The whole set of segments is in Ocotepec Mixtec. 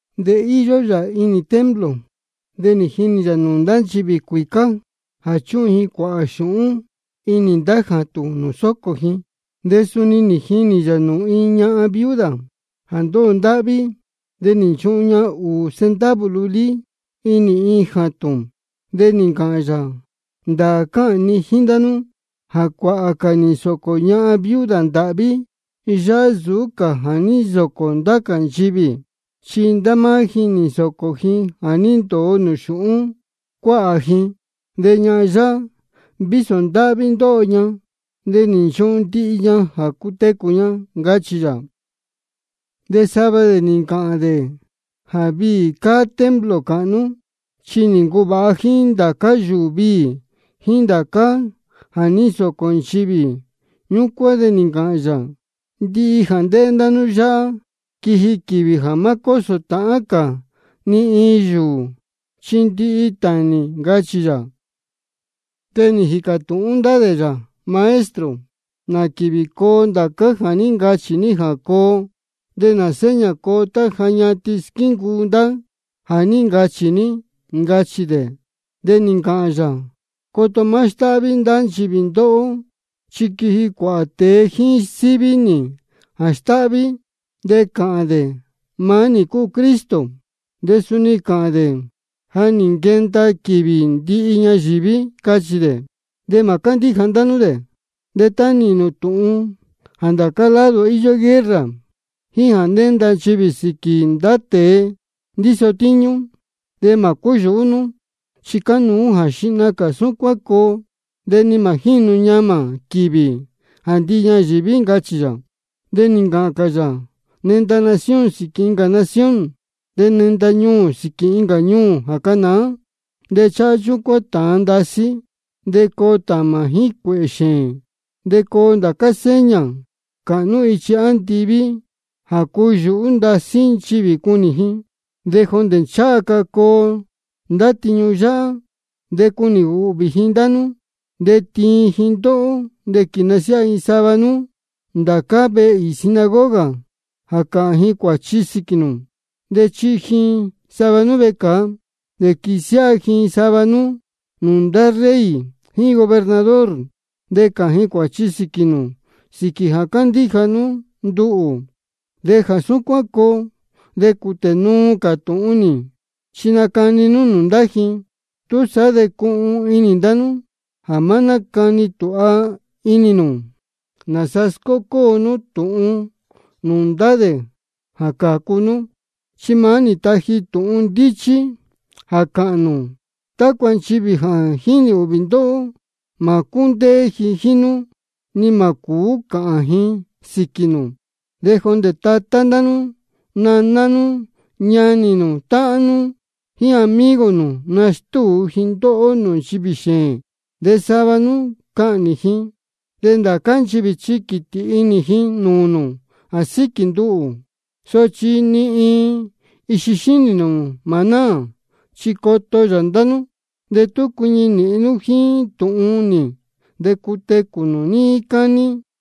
De íyó yā inī templo, de nī jinī yā nūū ndá nchivī cuīcá jā chúhun ji cuāhā xūhún inī ndá jātūn nūū sócō ji. De suni nī jinī yā nūū iin ñahan viuda jā ndóho ndáhví. De nī nchuhun ña ūū centavo lulí inī iin jātūn. De nī ncāhān yā: Ndāā cáhān ni jíín ndá nú jā cuāhā cā nī nsōcō ñahan viuda ndāhví yáhá nsūú cā jā ní nsōcō ndá cā nchivī. Chi ndá máá ji nī nsōcō ji jā ní ndōo nūū xūhún cuáhā ji. De ñahan yáhá, vísō ndáhví ndóho ña, de nī nchuhun ña ndihi jā cutecū ña, ncachī yā. De sava dē nī ncāhān dē jā viī cáá templo cāhnú, chi nī ncuvāha jíín ndācá yūū viī jíín ndācá jā ní nsōcō nchivī. Ñúcuán de nī ncāhān yā: Ndihi jā ndéhé ndá nú yáhá, quiji quīvī jā má cósō tāhán cā ni iin yūū, chi ndihi tānī, ncachī yā. De nī jīcā tūhún ndá dē yā: Maestro, ¿nā quīvī coo ndācá jā ní ncachī ní jā coo? ¿De nā seña coo tá ja ñatin squíncuu ndá jā ní ncachī ní? ncachī dē. De nī ncāhān yā: Coto má stáhví ndá nchivī ndóhó. Chi quiji cuāhā tēe jíín síví nī jā stáhví, de cāhān dē: Maá nī cúu Cristo. De suni cāhān dē: Ja nī nquenda quīvī ndihi ñayīví, cachī dē. De mā cándíja ndá nú dē. De tá nīhīn nū tūhun jā ndācá lado íyó guerra jíín jā nénda nchivī sīquī ndá tēe ndíso tíñú, de mā cúyūhú nú, chi cánuú jā xihna cā súcuán coo, de ni mā jínu ñamā quīvī jā ndihi ñayīví, ncachī yā. De nī ncāhān cā yā: Nenda nación sīquī incā nación, de nenda ñuū sīquī incā ñuū jā canāá. De cháhá chúcuán tāan ndasí, de coo tāmā jíín cuēhē xēēn. De coo ndá seña cāhnú ichi andiví jā cuyūhú ndasí nchivī cunī ji. De jondē ncháha ca coo ndá tiñu yáhá, de cunī ūhvī ji ndá nú, de tiin ji ndóhó. De quīsiáha ji sava nú ndācá vehe īī sinagoga jā cāhān ji cuāchi sīquī nū. De chihi ji sava nú vecāa. De quīsiáha ji sava nú nūū ndá rey jíín gobernador, de cāhān ji cuāchi sīquī nū sīquī jā cándíja nú nduhū. De jā súcuán coo, de cūtē nuu cā tūhun nī, chi nacani nú nūū ndá ji. Túsaá de cuhun inī ndá nú jā má nácani tūha inī nū nāsa scócóo nú tūhun nūū ndá dē jā cācu nú. Chi maá nī taji nī tūhun ndíchí jā cāhān nū, tácua nchivī jā jínī ūhvī ndóhó, mā cúndéé ji jíín nú ni mā cūú cāhān ji sīquī nū. De jondē tatá ndá nú, naná nú, ñanī nū, táhán nú, jíín amigo nū, nastúu ji ndóhó nūū nchivī xēēn. De sava nú cahnī ji. De ndācá nchivī chi quītī inī ji nūū nū jā síquī nduhū. Sochi ni iin ixi xínī nū mā náā, chi coto yā ndá nú. De tú cuiñi nīhin nú jíín tūhun nī, de cutecū nū níí cání.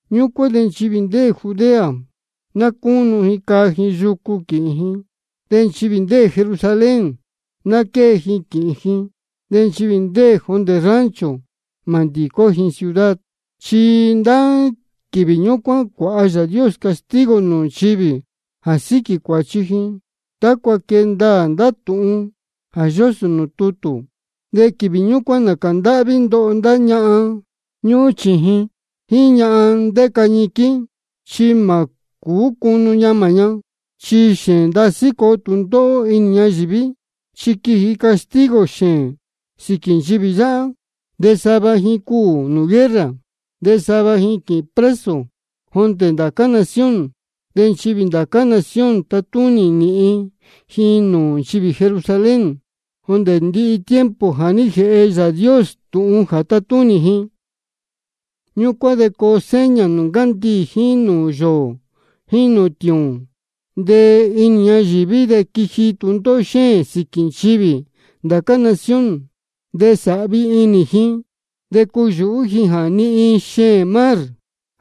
Ñúcuán de nchivī ndéē Judea, ná cúnu ji caa ji yucu quīhīn ji. De nchivī ndéē Jerusalén, ná quée ji quīhīn ji. De nchivī ndéē jondē rancho, mā nándicó ji ciudad. Chi ndá quīvī ñúcuán cuāha Yāā Dios castigo nūū nchivī jā síquī cuāchi ji, tácua quee ndaā ndá tūhun jā yósō nūū tutū. De quīvī ñúcuán nācā ndáhví ndoho ndá ñahan ñúhún sēhe, jíín ñahan ndéca ñiquín, chi mā cūú cunu ñamā ña. Chi xēēn ndasí coo tūndóhó inī ñayīví, de quiji castigo xēēn sīquī nchivī yáhá. De sava ji cuū nūū guerra, de sava ji quīhīn preso jondē ndá cā nación. De nchivī ndá cā nación tatúnī nīhin ji nūū nchivī Jerusalén, jondē ndihi tiempo jā jéhe Yāā Dios tūhun jā tátúnī ji. Ñúcuán de coo seña nūū ncandiī jíín nūū yōō jíín nūū tiūūn. De inī ñayīví de quiji tūndóhó xéēn sīquī nchivī ndācá nación. De cunēhén inī ji de cuyūhú ji jā nihin xeēn mar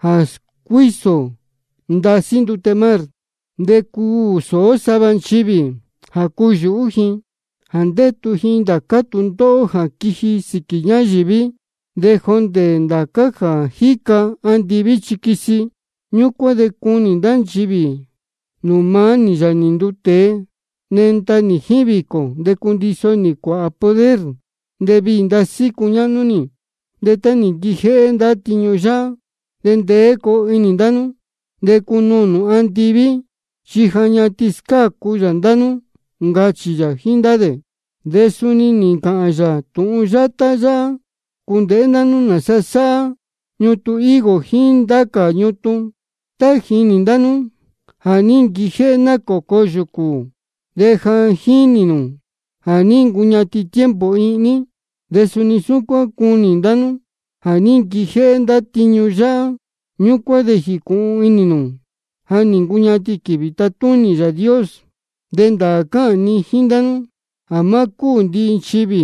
de scuísō ndasí ndute mar. De cuū sōó sava nchivī jā cuyūhú ji jā ndétu ji ndācá tūndóhó jā quiji sīquī ñayīví. De jondē ndācá jā jíca andiví chi quisi. Ñúcuán de cunī ndá nchivī nūū maá nī, Yāā nī nduu tēe, nenda nī jíín vīcō, de cundiso nī cuāhā poder, de viī ndasí cuñáhnú nī. De tá nī nquijéhé ndá tiñu yáhá, de ndeé coo inī ndá nú, de cunuū nū andiví, chi ja ñatin scácu yā ndá nú, ncachī yā jíín ndá dē. De suni nī ncāhān yā tūhun yátá yáhá: Cūndēhé ndá nú nāsa sáhá ñutun higo jíín ndá cā ñutun. Tá jínī ndá nú jā ní nquijéhé nácōco yūcū ji, de ja jínī nū ja nī ncuñatin tiempo ihní. De suni súcuán tá cunī ndá nú jā ní nquijéhé ndá tiñu yáhá, ñúcuán de jīcūhun inī nū ja nī ncuñatin quīvī tatúnī Yāā Dios. De ndāā cáhān ni jíín ndá nú jā má cúū ndihi nchivī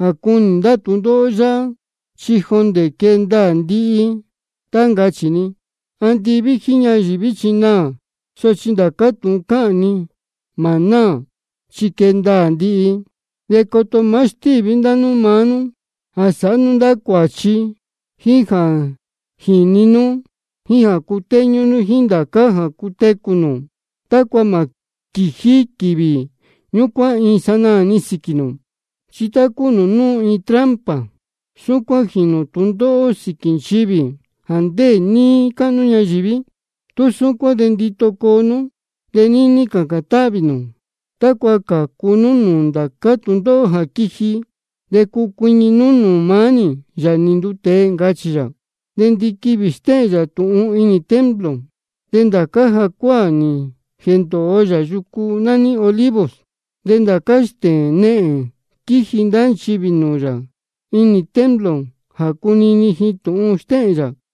jā cunī ndá tūndóhó yáhá, chi jondē quee ndaā ndihi tá ncachī ni. Andiví jíín ñayīví chi naā, sochi ndācá tūhun cáhān ni mā náā, chi quee ndaā ndihi. De coto má stíví ndá nú maá nú jā sāhá nú ndá cuāchi, jíín jā jīni nú, jíín jā cutéñú nú jíín ndācá jā cutecū nū, tácua mā quījí quīvī ñúcuán iin sanaā-ni sīquī nū. Chi tá cúu nūū núu iin trampa, súcuán jīnū tūndóhó sīquī nchivī jā ndéē níí cáhnú ñayīví. Tú súcuán de ndito coo nú, de níní cācān táhvī nū, tácua cuu cācu nú nūū ndācá tūndóhó jā quiji, de cuu cuiñi nú nūū maá nī, Yāā nī nduu tēe, ncachī yā. De ndiquivī stéhēn yā tūhun inī templo, de ndācá jacuáā nī jēndōo yā yucu nání Olivos. De ndācá stēēn nehēn quíji ndá nchivī nūū yā inī templo jā cunini ji tūhun stéhēn yā.